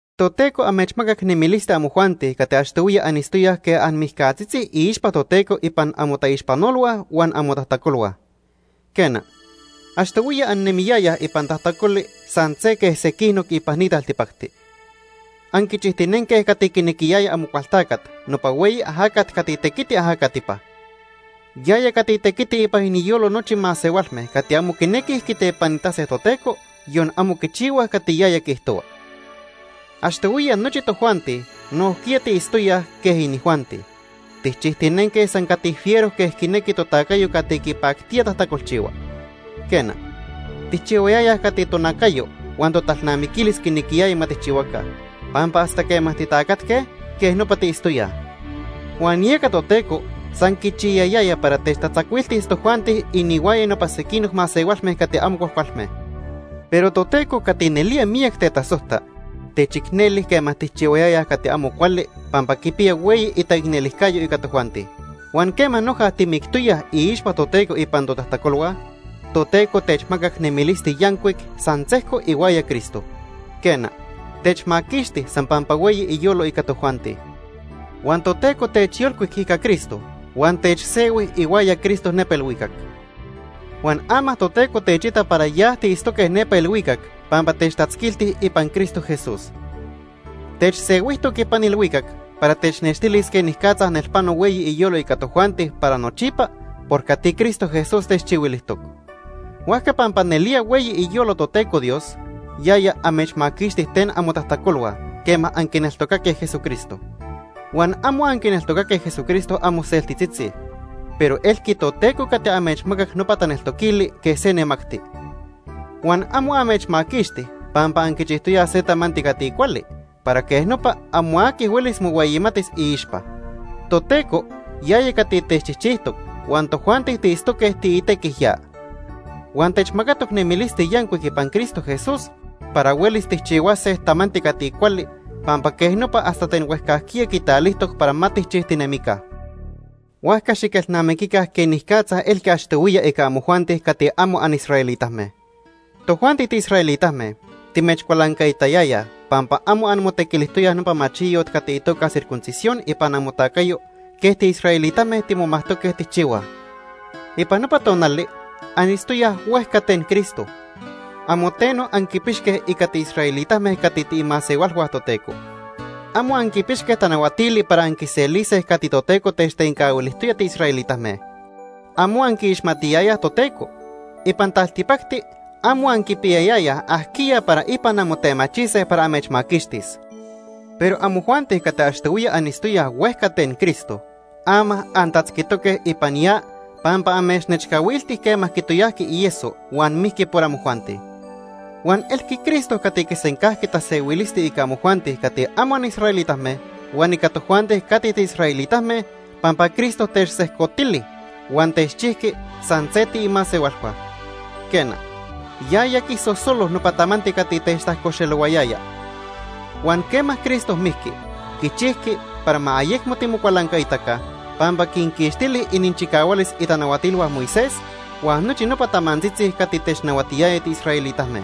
Toteco amechmacac nemilisti amojuanti cati achtohuiya anitztoyaj quej anmijcatzitzi iixpa Toteco ipan amotaixpanolhua huan amotajtacolhua. Quena, achtohuiya annemiyayaj ipan tajtacoli san se quej sequinoc ipan ni taltipacti. Anquichijtinenque cati quinequiyaya Amocualtacat, nopa hueyi ajacat cati tequiti ajacatipa. Yaya cati tequiti ipan iniyolo nochi masehualme cati amo quinequij quitepanitase Toteco, yon amo quichihuaj cati yaya quiijtohua. Achtohuiya nochi tojuanti nojquiya tiitztoyaj quej inijuanti. Tijchijtinenque san cati fiero quej quinequi totacayo cati quipactía tajtacolchihua. Quena, tijchihuayayaj cati tonacayo huan totalnamiquilis quinequiyaya ma tijchihuaca, pampa hasta quema titacatque, quej nopa tiitztoyaj. Huan yeca Toteco san quichiyayaya para techtatzacuiltis tojuanti inihuaya nopa sequinoc masehualme cati amo cuajcualme. Pero Toteco cati nelía miyac tetasojta, techicneli quema tijchihuayayaj cati amo cuali pampa quipiya hueyi itaicnelijcayo ica tojuanti. Huan quema noja timictoyaj iixpa Toteco ipan totajtacolhua, Toteco techmacac nemilisti yancuic san sejco ihuaya Cristo. Quena, techmaquixti san pampa hueyi iyolo ica tojuanti. Huan Toteco techyolcuic ica Cristo huan techsehui ihuaya Cristo nepa ilhuicac. Huan ama Toteco techita para ya tiitztoque nepa ilhuicac pampa techtatzquilti ipan Cristo Jesús. Techsehuijtoc ipan ilhuicac para technextilis quenicatza nelpano hueyi iyolo ica tojuanti para nochipa por cati Cristo Jesús techchihuilijtoc. Huajca pampa nelía hueyi iyolo Toteco Dios, yaya amechmaquixti ten amotajtacolhua quema anquineltocaque Jesucristo. Huan amo anquineltocaque Jesucristo anmoseltitzitzi, pero elqui Toteco cati amechmacac nopa taneltoquili quej se nemacti. Huan amo amechmaquixti pampa anquichijtoyaj se tamanti cati cuali para quej nopa amo aqui huelis mohueyimatis iixpa. Toteco yaya cati techchijchijtoc huan tojuanti tiitztoque tiitequij ya. Huan techmacatoc nemilisti yancuic ipan Cristo Jesús para huelis tijchihuase tamanti cati cuali pampa quej nopa hasta ten huejcajquiya quitalijtoc para ma tijchijtinemica. Huajca xiquelnamiquica quenicatza elqui achtohuiya ica amojuanti cati amo anisraelitame. Tojuanti tiisraelitame timechcualancaitayayaj pampa amo anmotequilijtoyaj nopa machiyot cati itoca circuncisión ipan amotacayo quej tiisraelitame timomajtoque tijchihuaj. Ipan nopa tonali anitztoyaj huejca ten Cristo. Amo teno anquipixque ica tiisraelitame cati tiimasehualhua Toteco. Amo anquipixque tanahuatili para anquiselise cati Toteco techtencahuilijtoya tiisraelitame. Amo anquiixmatiyayaj Toteco. Ipan taltipacti amo anquipiyayayaj ajquiya para ipan anmotemachise para amechmaquixtis. Pero amojuanti cati achtohuiya anitztoyaj huejca ten Cristo, ama antatzquitoque ipan ya pampa amechnechcahuilti quema quitoyajqui ieso huan mijqui por amojuanti. Huan elqui Cristo cati quisencajqui tasehuilisti ica amojuanti cati amo anisraelitame huan ica tojuanti cati tiisraelitame, pampa Cristo techsejcotili huan techchijqui san se tiimasehualhua. Quena, yaya quisosolo nopa tamanti cati techtajcoxelohuayaya. Huan quema Cristo mijqui, quichijqui para ma ayecmo timocualancaitaca, pampa quinquixtili ininchicahualis itanahuatilhua Moisés huan nochi nopa tamantzitzi cati technahuatiyaya tiisraelitame.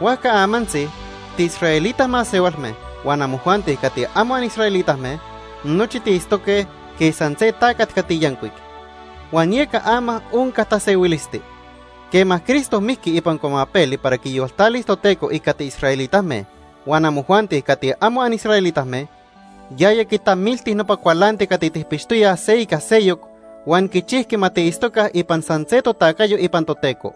Huajca amantzi tiisraelita masehualme huan amojuanti cati amo anisraelitame, nochi tiitztoque quej san se tacat cati yancuic. Huan yeca ama onca tasehuilisti. Quema Cristo mijqui ipan cuamapeli para quiyoltalis Toteco ica tiisraelitame huan amojuanti cati amo anisraelitame, yaya quitamilti nopa cualanti cati tijpixtoyaj se ica seyoc huan quichijqui ma tiitztoca ipan san se totacayo ipan Toteco.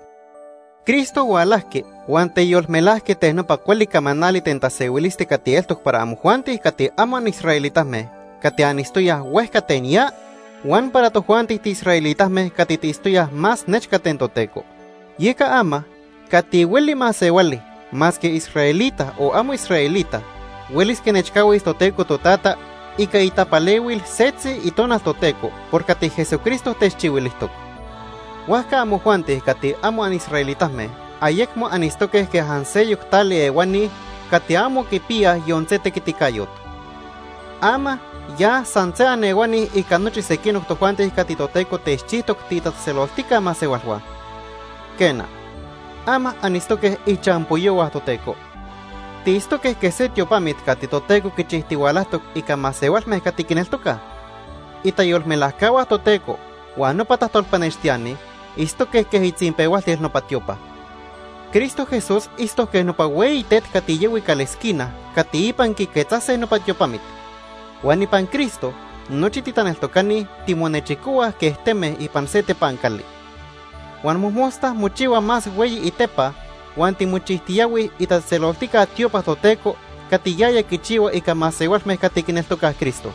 Cristo hualajqui huan teyolmelajqui ten nopa cuali camanali ten tasehuilisti cati eltoc para amojuanti cati amo anisraelitame cati anitztoyaj huejca ten ya huan para tojuanti tiisraelitame cati tiitztoyaj más nechca ten Toteco. Yeca ama, cati hueli masehuali masque israelita o amo israelita huelis quinechcahuis Toteco Totata ica itapalehuil setzi Itonal Toteco por cati Jesucristo techchihuilijtoc. Huajca amojuanti cati amo anisraelitame ayecmo anitztoque quej anseyoc tali ehuani cati amo quipiyaj yon se tequiticayot. Ama ya san se anehuani ica nochi sequinoc tojuanti cati Toteco techchijtoc tiitatzejtzeloltica masehualhua. Quena, ama anitztoque ichampoyohua Toteco. Tiitztoque quej se tiopamit cati Toteco quichijtihualajtoc ica masehualme cati quineltocaj. Itayolmelajcahua Toteco huan nopa tajtolpanextiani quej itzinpehualtil nopa itiopa. Cristo Jesús itztoc quej nopa hueyi tet cati yahui calesquina cati ipan quiquetzase nopa tiopamit. Huan ipan Cristo nochi titaneltocani timonechicohuaj quej teme ipan se tepancali. Huan mojmosta mochihua más hueyi itepa huan timochijtiyahuij itatzejtzeloltica tiopa Toteco cati yaya quichihua ica masehualme cati quineltocaj Cristo.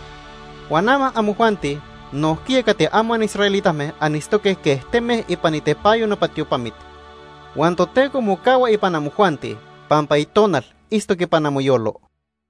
Huan ama amojuanti nojquiya cati amo anisraelitame anitztoque quej teme ipan itepanyo nopa tiopamit, huan Toteco mocahua ipan amojuanti pampa Itonal itztoc ipan amoyolo.